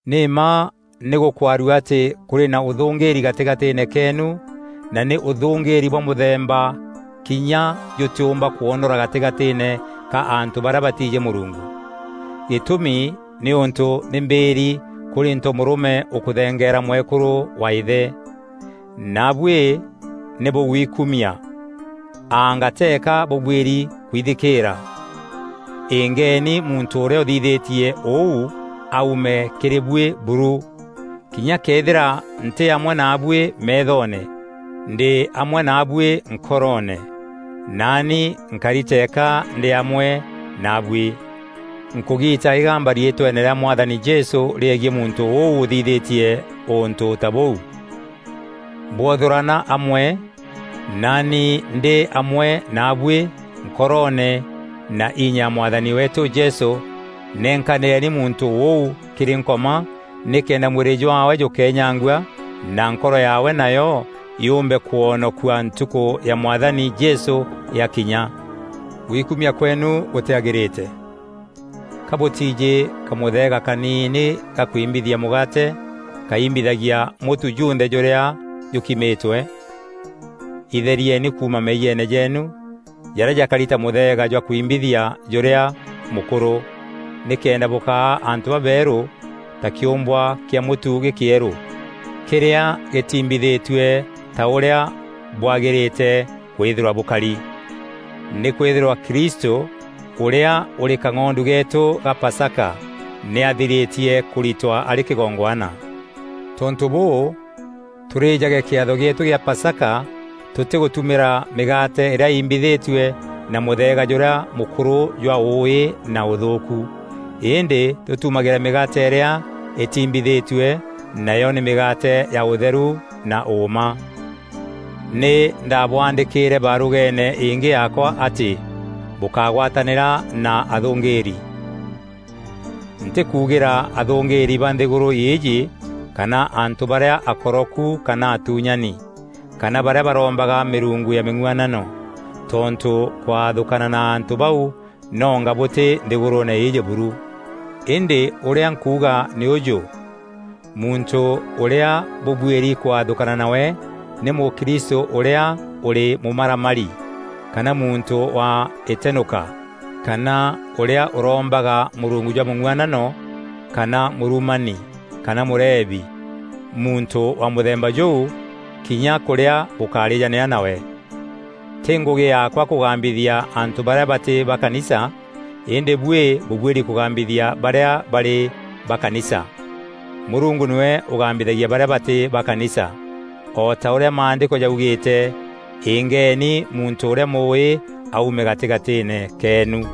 Nî mma nî gûkwarua atî kûrî na ûthûngîîri gatîgatîîne keenu na nî ûthûngîîri bwa mûthemba kinya jûtîûmba kwonora gatîgatîîne ka antû barîa batiijî Mûrungu. Gîtûmi nîûntû nî mbîîri kûrî ntomûrûme ûkûthengeera mwekûrû wa îthe. Naabuî nî bûgwiikumia! Anga teeka bûbuîri kwithikîîra? Îngeeni muntû ûrîa ûthithîtie ûu aume kîrî buî buru. Kinya këethîra ntî amwe naabuî meethoone, ndî amwe naabuî nkoroone. Naani nkari tëeka ndî amwe naabuî, nkûgiita îgamba riîtweene rîa Mwathani Jesû rîegiî muntû ûu ûthithîtie ûntû ta bûu. Bwothûrana amwe, naani ndî amwe naabuî nkoroone na inya ya Mwathani weetû Jesû, nenkanîreni muntû ûu kîrî Nkoma nîkenda mwîrî jwaawe jûkenyangua na nkoro yaawe nayo yûûmbe kwonokua Ntukû ya Mwathani Jesû yakinya. Gwikumia kweenu gûtîagîrîte. Ka bûtiijî kamûtheega kaniini ga kwimbithia mûgaate, kaimbithagia mûtu junthe jûrîa jûkimîtwe? Itherieni kuuma meeyiene jeenu, jarîa jakari ta mûtheega jwa kwimbithia jûrîa mûkûrû, nîkenda bûkaa antû babeerû ta kîûmbwa kîa mûtu gîkîerû, kîrîa gîtimbithîtue ta ûrîa bwagîrîte kwîthîrwa bûkari. Nî kwîthîrwa Kristû, ûrîa ûrî kang'ondu geetû ga Pasaka, nî athirîtie kûritwa arî kîgongwana. Tontû bûû, tûrîjage kîatho gîetû kîa Pasaka tûtîgûtumîra mîgaate îrîa iimbithitue na mûtheega jûrîa mûkûrû jwa ûûî na ûthûûku. Îndî tûtumagîre mîgaate îrîa îtiimbithîtue, nayo nî mîgaate ya ûtheru na ûûma. Nî ndabwaandîkîîre barûgeene îngî yaakwa atî bûkagwatanîra na athûngîîri. Ntîkugîra athûngîîri ba nthîgûrû îîjî kana antû barîa akoroku kana atuunyani, kana barîa barombaga mîrungu ya mîng'uanano; tontû kwathûkana na antû bau nonga bûtî nthîgûrûûne îîjî buru. Îndî ûrîa nkuuga nî ûjû: muntû ûrîa bûbuîri kwathûkana nawe nî mûkristû ûrîa ûrî mûmaramari, kana muntû wa îtenûka, kana ûrîa ûrombaga mûrungu jwa mûng'uanano, kana mûrumani kana mûrebi; muntû wa mûthemba jûu, kinya kûrîa bûkárîjanîra nawe. Tî ngûgî yaakwa kûgambithia antû barîa batî ba kanisa îndî buî bûbuîri kûgambithia barîa barî ba kanisa. Mûrungu nîwe ûgambithagia barîa batî ba kanisa. O ta ûrîa Maandîko jaugîîte, “Îngeeni muntû ûrîa mûûî aume gatîgatîîne keenu.”